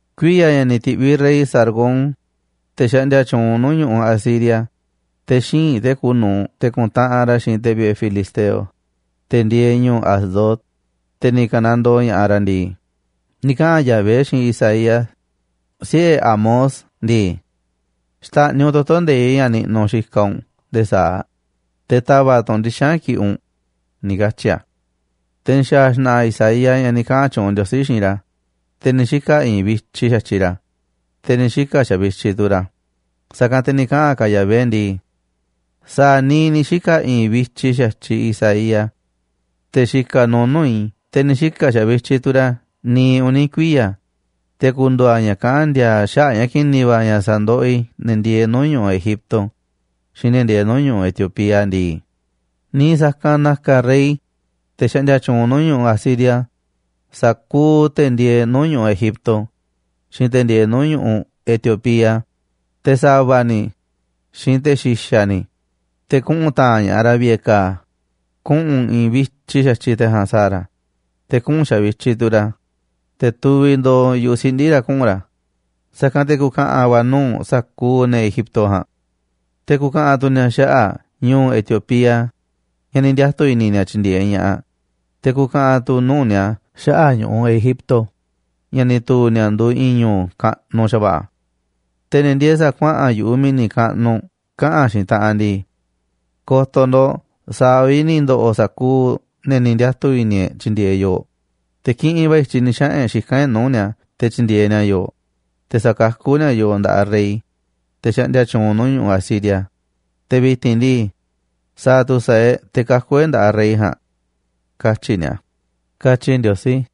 Kuiya̱ ña̱ ni̱ ti̱ꞌviꞌ rey Sargón, te̱ xaꞌndia tyuunꞌ nuu̱ꞌ ñu̱ꞌuꞌ Asiria, te̱ xíinꞌ te̱ kuuꞌ nu̱uꞌ ra̱, te̱ ku̱ntaꞌanꞌ ra̱ xiinꞌ te̱ vi̱ꞌe̱ filisteo, te̱ ndieeꞌ ñuuꞌ Asdod, te̱ ni̱ ka̱nandoo ña̱ꞌaꞌ ra̱ ndii, ni̱ kaꞌa̱n Yahvé xiinꞌ Isaías, siꞌe̱ Amoz ndii: “Xta̱ꞌniꞌ u̱nꞌ toto̱ nde̱iꞌ ña̱ niꞌnuꞌ u̱nꞌ xikaꞌ u̱nꞌ nde̱e̱ sa̱aꞌ, te̱ ta̱va̱ꞌ tu̱ u̱nꞌ ndixa̱nꞌ ña̱ kiꞌiꞌ u̱nꞌ”, ni̱ katyi̱ a̱. Te̱ ni̱ xa̱a̱ xna̱ꞌa̱ Isaías ña̱ ni̱ kaꞌa̱n tyuunꞌ Ndiosí xiinꞌ ra̱, te̱ ni̱ xika̱ i̱i̱nꞌ vityiꞌ xa̱tyiꞌ ra̱, te̱ ni̱ xika̱ xavityiꞌ tu̱ ra̱. Sa̱kanꞌ te̱ ni̱ kaꞌa̱n ka̱ Yahvé ndii: “Sa̱a̱ niiꞌ ni̱ xika̱ i̱i̱n vityiꞌ xa̱tyiꞌ Isaías, te̱ xikaꞌ nuuꞌ nuu̱ꞌ i̱, te̱ ni̱ xika̱ xavityiꞌ tu̱ ra̱ niiꞌ uni̱ kuiya̱, te̱ ku̱ndu̱u̱ a̱ ña̱ kaꞌán ndi̱a̱a̱ xaꞌa̱ꞌ ña̱ ki̱ni̱ va̱ ña̱ sa̱ndoꞌoꞌ i̱ ne̱ ndieeꞌ nuu̱ꞌ ñu̱ꞌuꞌ Egipto xiinꞌ ne̱ ndieeꞌ nuu̱ꞌ ñu̱ꞌuꞌ Etiopía ndii, niiꞌ sa̱kanꞌ na̱ka̱ rey, te̱ xaꞌndia tyuunꞌ nuu̱ꞌ ñu̱ꞌuꞌ Asiria, sa̱kuuꞌ te̱ ndieeꞌ nuu̱ꞌ ñu̱ꞌuꞌ Egipto xiinꞌ te̱ ndieeꞌ nuu̱ꞌ ñu̱ꞌuꞌ Etiopía, te̱ sa̱va̱ ni̱ xiinꞌ te̱ xi̱xa̱ ni̱, te̱ kuꞌu̱n ta̱a̱nꞌ ña̱ꞌaꞌ ra̱ vi̱ꞌe̱ ka̱a̱. Kuꞌu̱n i̱i̱nꞌ vityiꞌ xa̱tyiꞌ te̱ ja̱a̱nꞌ sa̱a̱ ra̱, te̱ kuꞌu̱n xavityiꞌ tu̱ ra̱, te̱ tuviꞌ ndooꞌ yu̱ꞌuꞌ siꞌndi̱ ra̱ kuꞌu̱n ra̱, sa̱kanꞌ te̱ ku̱ka̱ꞌa̱n va̱ nuu̱ꞌ sa̱kuuꞌ ne̱ Egipto ja̱a̱nꞌ. Te̱ ku̱ka̱ꞌa̱n tu̱ ni̱a̱ xaꞌa̱ꞌ ñu̱u̱ Etiopía ña̱ ni̱ ndiatu̱ i̱ni̱ ni̱a̱ tyi̱ndi̱e̱eꞌ ña̱ꞌaꞌ, te̱ ku̱ka̱ꞌa̱n tu̱ nuu̱ꞌ ni̱a̱ xaꞌa̱ꞌ ñu̱u̱ Egipto ña̱ ni̱ tu̱u̱ ni̱a̱ nduuꞌ i̱i̱n ñu̱u̱ kaꞌnuꞌ xa̱va̱ꞌa̱. Te̱ ne̱ ndieeꞌ sa̱a̱ kuaꞌa̱n yu̱ꞌuꞌ mi̱ni̱ kaꞌnuꞌ kaꞌa̱n xiinꞌ taꞌanꞌ ndii: Ko̱to̱ ndo̱ꞌ, sa̱a̱ vi̱ꞌ ni̱ ndo̱ꞌo̱ sa̱kuuꞌ ne̱ ni̱ ndiatu̱ i̱ni̱ e̱ꞌ tyi̱ndi̱e̱eꞌ yooꞌ, te̱ kiꞌinꞌ va̱ i̱tyiꞌ ni̱ xaꞌa̱n e̱ꞌ xikán e̱ꞌ nuu̱ꞌ ni̱a̱ te̱ tyi̱ndi̱e̱eꞌ ni̱a̱ yooꞌ, te̱ sa̱kakú ni̱a̱ yooꞌ nda̱ꞌaꞌ rey, te̱ xaꞌndia tyuunꞌ nuu̱ꞌ ñu̱ꞌuꞌ Asiria. Te̱ vi̱ti̱n ndii, ¿sa̱a̱ tu̱ sa̱a̱ e̱ꞌ te̱ kaku̱ e̱ꞌ nda̱ꞌaꞌ rey ja̱a̱nꞌ?, katyi̱ ni̱a̱”, katyi Ndiosí.